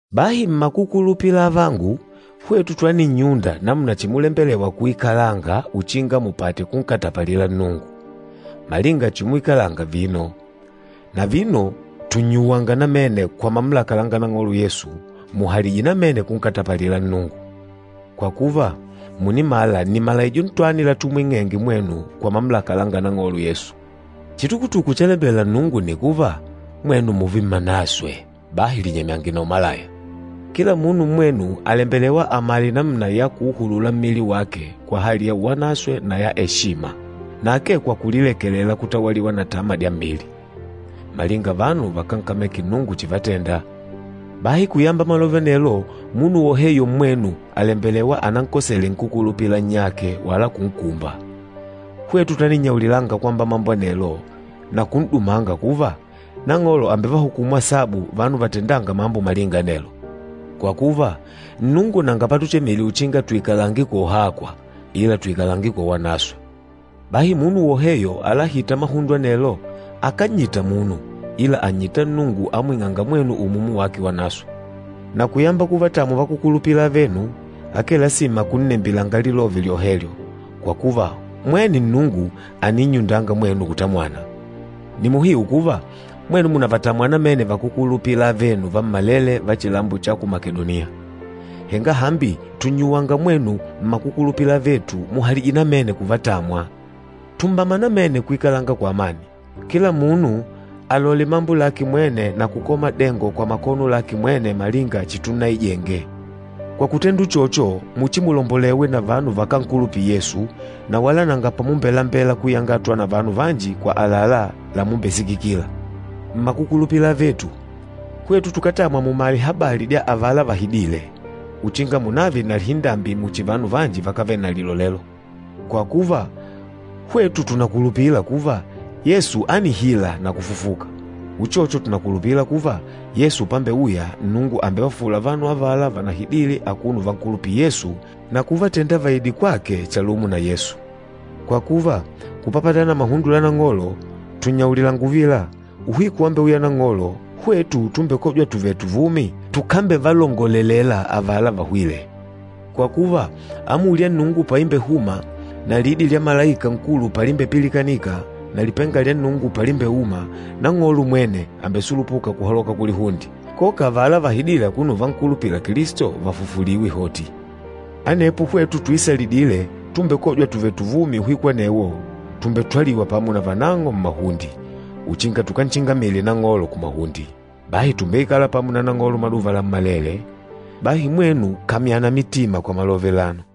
Bahi mmakukulupila avangu, hwetu twaninnyunda namuna chimulembelewa kuikalanga uchinga mupate kunkatapalila Nnungu, malinga chimuikalanga vino. Na vino tùnnyuwanga namene kwa mamulaka langa Nang'olo Yesu, muhalije namene kunkatapalila Nnungu. Kwa kuva, mùnimala nni malaijo ntwani latumwing'enge mwenu kwa mamulaka langa Nang'olo Yesu. Chitukutuku chalembela Nnungu nni kuva, mwenu mùùve mmanaswe. Bahi linyemyange na umalaya. Kila munu mmwenu àlembelewa amale namuna ya kuuhulula mmili wake kwa hali ya uwanaswe na ya eshima, na akee kwa kulilekelela kutawaliwa na tama dya mmili, malinga vanu vakánkameke Nnungu chivatenda. Bahi kuyamba malove anelo, munu woheyo mmwenu àlembelewa anankosele nkúkulupila nnyake wala kunkumba. Hwetu twaninnyaulilanga kwamba mambo anelo na kun'dumanga kuva, Nang'olo àmbevahukumu asabu vanu vatendânga mambo malinga anelo. Kwa kuva, Nnungu nanga patuchemile uchinga tuikalange kwa uhakwa, ila tuikalange kwa uwanaswe. Bahi munu woheyo alahîta mahundo anelo, akánnyita munu, ila ànnyita Nnungu amwing'ânga mwenu Umumu wake Wanaswe. Na kuyamba kuvatamwa vakúkulupila avenu, akee lasima kunnembilanga lilove lyohelyo, kwa kuva mwene Nnungu àninnyundanga mwenu kutamwana. Nni muhiu kuva, mwenu mùnavatamwa namene vakúkulupila avenu vammalele va chilambo cha ku Makedoniya. Henga hambi tùnnyuwanga mwenu mmakukulupila avetu, muhalije namene kuvatamwa. Tumbama namene kuikalanga kwa amani. Kila munu alole mambo lake mwene na kukola madengo kwa makono lake mwene malinga chitunnaijenge. Kwa kutenda uchocho, muchimulombolewe na vanu vakánkulupila Yesu, na wala nanga pamumbelambela kuyangatwa na vanu vanji kwa àlalá lamumbesikikila. Mmakukulupila avetu, hwetu tukátamwa munamale habali dya avala vahidîle, uchinga munave na lihindambi muchi vanu vanji vakávele na lilolelo. Kwa kuva, hwetu tùnakulupila kuva, Yesu ánihila na kufufuka, uchocho tùnakulupila kuva, Yesu pambeuya, Nnungu àmbevafufula vanu avala vanahidile akuno uvankulupila Yesu na kuvatenda vaide kwake chalumo na Yesu. Kwa kuva, kupapatana na mahundo la Nang'olo, tùnnyaulilanga uvila, uhiku wambeuya Nang'olo, hwetu tumbekôjwa tuvèlè tuvumi, tukambevalongolelela avala vahwîle. Kwa kuva, amuli ya Nnungu paimbehuma, na lidi lya malaika nkulu palimbepilikanika, na lipenga lya Nnungu palimbeuma, Nang'olo mwene àmbesulupuka kuhaloka kulihunde. Koka avala vahidîle akuno uvankulupila Kilisto, vàmbefufuliwa hoti. Anepo hwetu tuisalidîle, tumbekôjwa tuvèlè tuvumi uhiku anewo, tùmbetwaliwa pamo na vanang'o mmahunde, uchinga tukanchingamile Nang'olo kumahunde. Bahi tùmbeikala pamo na Nang'olo maduva lammalele. Bahi mwenu kamyana mitima kwa malove alano.